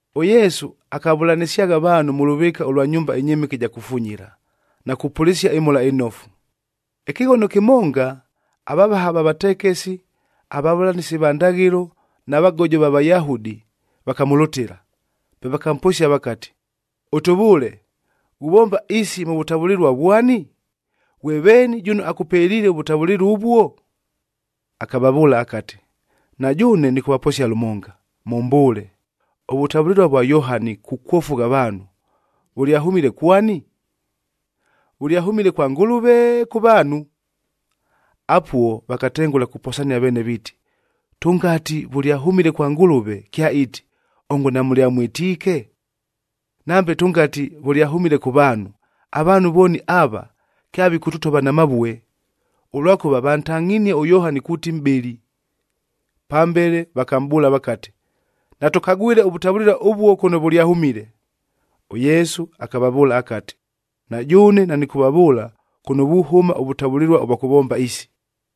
ɄYesu akavʉlanɨsyagha avaanhu mʉ lʉvɨɨka ʉlwa nyumba ɨnyɨmɨke ɨja kufunyila, na kupʉlɨsia ɨMhola ɨNofu. Ɨkɨghono kɨmonga, avavaha va vatekesi, avavʉlanɨsi va ndaghɨlo, na vagojo va Vayahudi vakamʉlʉtɨla, pe vakamposia vakati, “Ʉtʉvʉʉle, ghuvomba isi mʉ vʉtavʉlɨlua vwani?a Ghwe veeni jʉno akʉpeliile ʉvʉtavʉlɨlua ʉvuo?” Akavavʉʉla akati, “Na jʉʉne nɨkʉvaposia lʉmonga, mʉmbʉʉle, ʉvʉtavʉlɨlua ʉvwa Yohani kukwofugha avaanhu, vʉlyahʉmile kwani? Vʉlyahʉmile kwa Ngʉlʉve, kʉ vaanhu?” Apuo, vakatengʉla kuposania veene viiti, “Tʉngati vʉlyahʉmile kwa Ngʉlʉve, kyaiiti, ‘Ongo namʉlyamwɨtiike?’ Nambe tʉngati vʉlyahʉmile kʉ vaanhu, avaanhu vooni ava, kyavikʉtʉtova na mavue, ʉlwakʉva vantangʼhinie ʉYohani kuuti mʼbɨli.” Pambele, vakamʼbʉʉla vakati, “Natʉkagwile ʉvʉtavʉlɨlua ʉvuo kʉno vʉlyahʉmile.” ɄYesu akavavʉʉla akati, “Na jʉʉne, nanɨkʉvavʉʉla kʉno vuhʉma ʉvʉtavʉlɨlua ʉvwa kʉvomba isi.”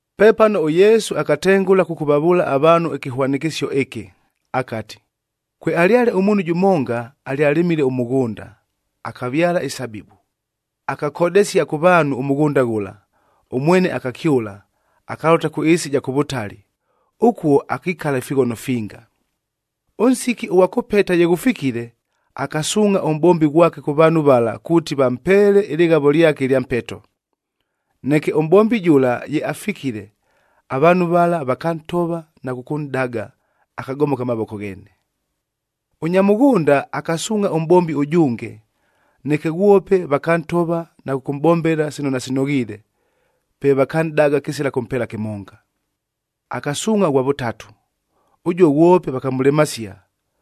Pepano ʉYesu akatengʉla kʉkʉvavʉʉla avaanhu ɨkɨhwanɨkɨsio ɨkɨ, akati, “Kwealyale ʉmuunhu jʉmonga alyalɨmile ʉmʉghʉnda,b akavyala isabibu. Akakodesia kʉ vaanhu ʉmʉghʉnda ghʉla, ʉmwene akakyʉla, akalʉta kʉ ɨɨsi ɨja kʉ vʉtali. Ʉkuo akikala ifighono finga. “Ʉnsiki ʉghwa kʉpeta ye ghʉfikile, akasuungʼha ʉmʼbombi ghwake kʉ vaanhu vala kuuti vampeele ɨlɨghavo lyake ɨlya mpeto. Neke ʉmʼbombi jʉla ye afikile, avaanhu vala vakantova na kʉkʉnʼdaga, akagomoka mavoko gheene. “Ʉnya mʉghʉnda, akasuungʼha ʉmʼbombi ʉjʉnge. Neke ghwope vakantova na kʉkʉmʼbombela sino nasinoghiile, pe vakanʼdaga kɨsila kʉmpeela kɨmonga. Akasuungʼha ʉghwa vʉtatu. Ʉjuo ghwope vakamʉlemasia,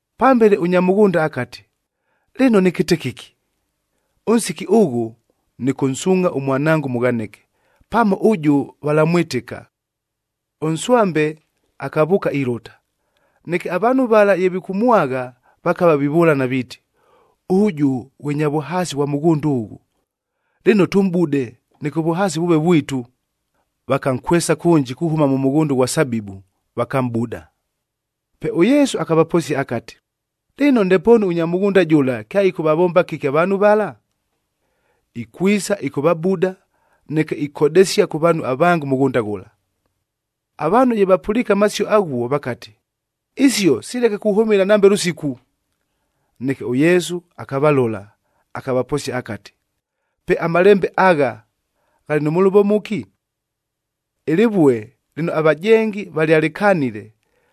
“Pambele, ʉnya mʉghʉnda akati, ‘Lɨno nɨkɨte kɨki? Ʉnsiki ʉghʉ, nɨkʉnsuungʼha ʉmwanango ʉmʉghanɨke! Pamo ʉjʉ valamwɨtɨka.’ Ʉnswambe akavʉʉka ilʉta, neke avaanhu vala ye vikʉmwagha, vakava vivʉlana viiti, ‘Ʉjʉ ghwe nya vʉhaasi ghwa mʉghʉnda ʉghʉ. Lɨno, tʉmʼbude, neke ʉvʉhaasi vʉʉve vwitu.’ Vakankwesa kʉnji kuhʉma mʉghʉnda ʉghwa sabibu, vakamʼbuda.” Pe ʉYesu akavaposia akati, “Lɨno, ndepoonu ʉnya mʉghʉnda jʉla kyaɨkʉvavomba kɨki avaanhu vala? Ikwisa ɨkʉvabuda, neke ikodesia kʉ vaanhu avange ʉmʉghʉnda ghʉla.” Avaanhu ye vapʉliike amasio aghuo, vakati, “Isio sileke kuhʉmɨla nambe lʉsiku!” Neke ʉYesu akavalola, akavaposia akati, “Pe amalembe agha, ghalɨ nʉ mʉlʉvo mʉki? ‘Ɨlɨvue lɨno avajengi valyalɨkanile,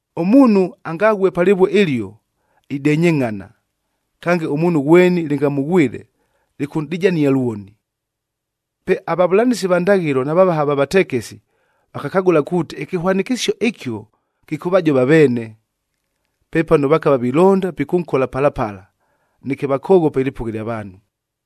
“Ʉmuunhu angaghue pa lɨvue ɨlio, idenyengʼhana, kange ʉmuunhu ghweni lɨngamʉghwɨle, lɨkʉnʼdijania lwoni.” Pe avavʉlanɨsi va ndaghɨlo na vavaha va vatekesi, vakakagʉla kuuti ɨkɨhwanɨkɨsio ɨkio kɨkʉvajova aveene. Pepano vakava vilonda pikʉnkola pala pala, neke vakoghopa ɨlɨpʉgha ɨlya vaanhu.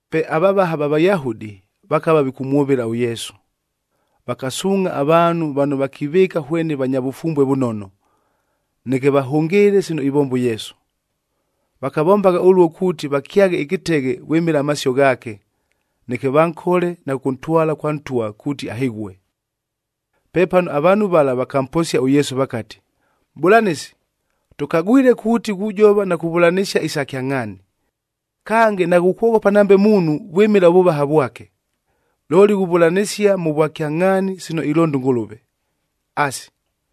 Pe avavaha va Vayahudi, vakava vikʉmwʉvɨla ʉYesu. Vakasuungʼha avaanhu vano vakivɨɨka hwene vanya vʉfumbue vʉnono, neke vahʉngɨɨle sino ivomba ʉYesu. Vakavombagha ʉluo kuuti vakyaghe ɨkɨteghe vwɨmɨla amasio ghaake, neke vankole na kʉkʉntwala kwa ntwa kuuti ahɨghue. Pepano avaanhu vala vakamposia ʉYesu vakati, “Mʼbʉlanɨsi, tʉkagwile kuuti ghujova na kuvʉlanɨsia isa kyangʼhaani. Kange, naghukwoghopa nambe muunhu vwɨmɨla ʉvʉvaha vwake, looli ghuvʉlanɨsia mʉ vwakyangʼhaani sino ilonda ʉNgʉlʉve. Asi,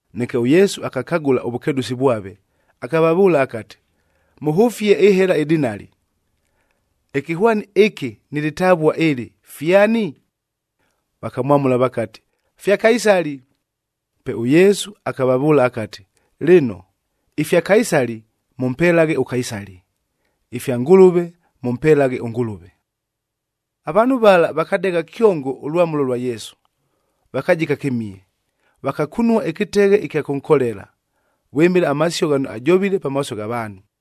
Neke ʉYesu akakagʉla ʉvʉkedʉsi vwave, akavavʉʉla akati, “Mʉhʉfie ɨhela ɨdinali. Ɨkɨhwani ɨkɨ nɨ lɨtavua ɨlɨ, fyani?” Vakamwamʉla vakati, “Fya Kaisali.” Pe ʉYesu akavavʉʉla akati, “Lɨno, ifya Kaisali, mʉmpelaghe ʉKaisali; ifya Ngʉlʉve, mʉmpelaghe ʉNgʉlʉve.” Avaanhu vala vakadegha kyongo ʉlwamʉlo lwa Yesu, vakajika kɨmihe. Vakakunua ɨkɨteghe ɨkya kʉnkolela, vwɨmɨla amasio ghano ajovile pamaaso gha vaanhu.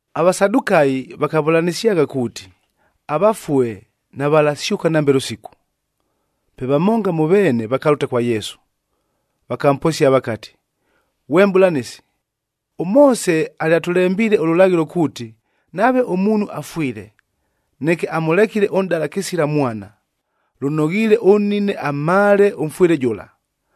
AVasadukayif vakavʉlanɨsyagha kuuti, avafue navalasyʉka nambe lʉsiku. Pe vamonga mʉ veene vakalʉta kwa Yesu, vakamposia vakati, “Ghwe Mʼbʉlanɨsi, ʉMoose alyatʉlembiile ʉlʉlaghɨlo kuuti, nave ʉmuunhu afwile, neke amʉlekile ʉnʼdala kɨsila mwana, lʉnoghiile ʉnnine amhaale ʉmfwɨle jʉla,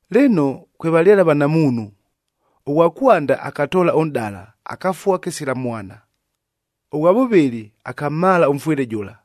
Lɨno, kwevalyale avanamuunhu. Ʉghwa kwanda akatoola ʉnʼdala, akafua kɨsila mwana. Ʉghwa vʉvɨlɨ, akamhaala ʉmfwɨle jʉla,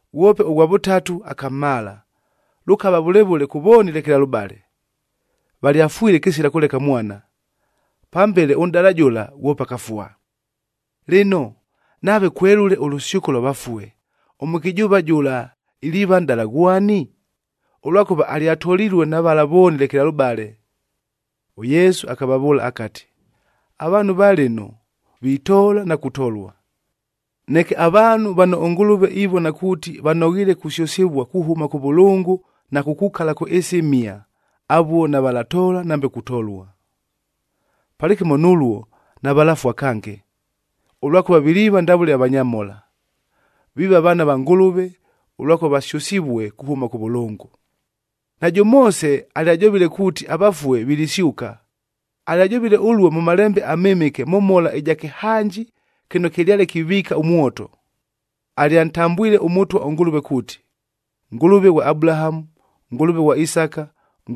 Ghwope ʉghwa vʉtatu akamhaala, lʉkava vʉle vʉle kʉ vooni lekelalʉbale, valyafwile kɨsila kʉleka mwana. Pambele, ʉnʼdala jʉla ghwope akafua. Lɨno, nave kwelʉle ʉlʉsyʉko lwa vafue, ʉmʉkɨjʉʉva jʉla iliiva nʼdala ghwani? Ʉlwakʉva alyatolilue na vala vooni lekelalʉbale.” ɄYesu akavavʉʉla akati, “Avaanhu va lɨno, vitoola na kutolua. Neke avaanhu vano ʉNgʉlʉve ivona kuuti vanoghiile kusyʉsɨvua kuhʉma kʉvʉlʉngʉi na kukukala kʉ ɨɨsi ɨmhia, avuo navalatoola, nambe kutolua. Palɨkɨmo nʉluo navalafua kange, ʉlwakʉva viliiva ndavʉle avanyamhola. Viiva vaana va Ngʉlʉve, ʉlwakʉva vasyʉsivue kuhʉma kʉvʉlʉngʉ. “Najʉ Moose alyajovile kuuti avafue vilisyʉka. Alyajovile ʉluo mʉ Malembe aMɨmɨke mʉ mhola ɨja kɨhanji kɨno kɨlyale kiviika ʉmwoto. Alyantambwile ʉMʉtwa ʉNgʉlʉve kuuti, ‘Ngʉlʉve ghwa Abulahamu, Ngʉlʉve ghwa Isaka,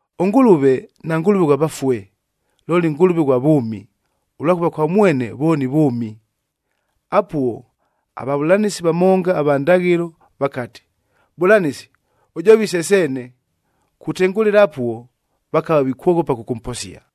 ɄNgʉlʉve naNgʉlʉve ghwa vafue, looli Ngʉlʉve ghwa vʉʉmi, ʉlwakʉva kwa mwene vooni vʉʉmi.” Apuo, avavʉlanɨsi vamonga ava ndaghɨlo vakati, “Mʼbʉlanɨsi, ʉjovile se seene!” Kutengʉlɨla apuo, vakava vikwoghopa kʉkʉmposia.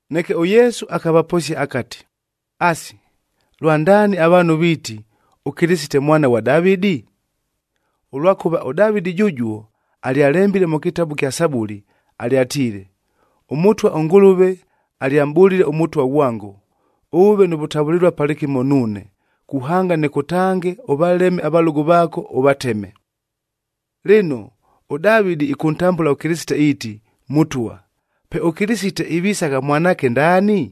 Neke ʉYesu akavaposia akati, “Asi, lwandaani avaanhu viiti, ʉKɨlɨsite Mwana ghwa Davɨdi? Ʉlwakʉva ʉDavɨdi jʉjuo, alyalembile mʉ kɨtabu kya Sabuli, alyatiile, ‘ɄMʉtwa ʉNgʉlʉve alyamʼbʉlile ʉMʉtwa ghwango, “Ʉʉve nʉ vʉtavʉlɨlua palɨkɨmo nuune, kuhanga nɨkʉtange ʉvaleme avalʉgʉ vaako, “Lɨno, ʉDavɨdi ɨkʉntambʉla ʉKɨlɨsite iiti, ‘Mʉtwa.’ Pe ʉKɨlɨsite ivisagha mwanaake ndaani?”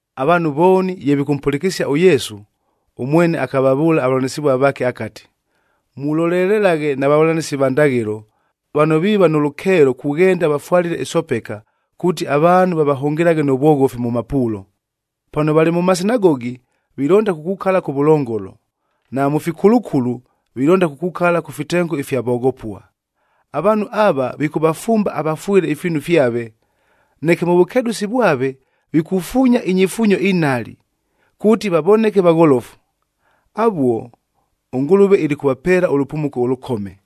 Avaanhu vooni ye vikʉmpʉlɨkɨsia ʉYesu, ʉmwene akavavʉʉla avavʉlanɨsɨvua vaake akati, “Mulolelelaghe na vavʉlanɨsi va ndaghɨlo, vano viiva nʉ lʉkeelo kughenda vafwalile isopeka, kuuti avaanhu vavahʉngɨlaghe nʉ vwoghofi mʉ mapuulo. Pano valɨ mʉ masinagogi, vilonda kukukala kʉvʉlongolo. Na mʉ fikulukulu vilonda kukukala kʉ fitengo ifya voghopua. Avaanhu ava vikʉvafumba avafwɨle ifiinu fyave. Neke mʉ vʉkedʉsi vwave vikufuunya inyifuunyo inhali, kuuti vavoneke vagholofu. Avuo, ʉNgʉlʉve ilikʉvapeela ʉlʉpumuko ʉlʉkome!”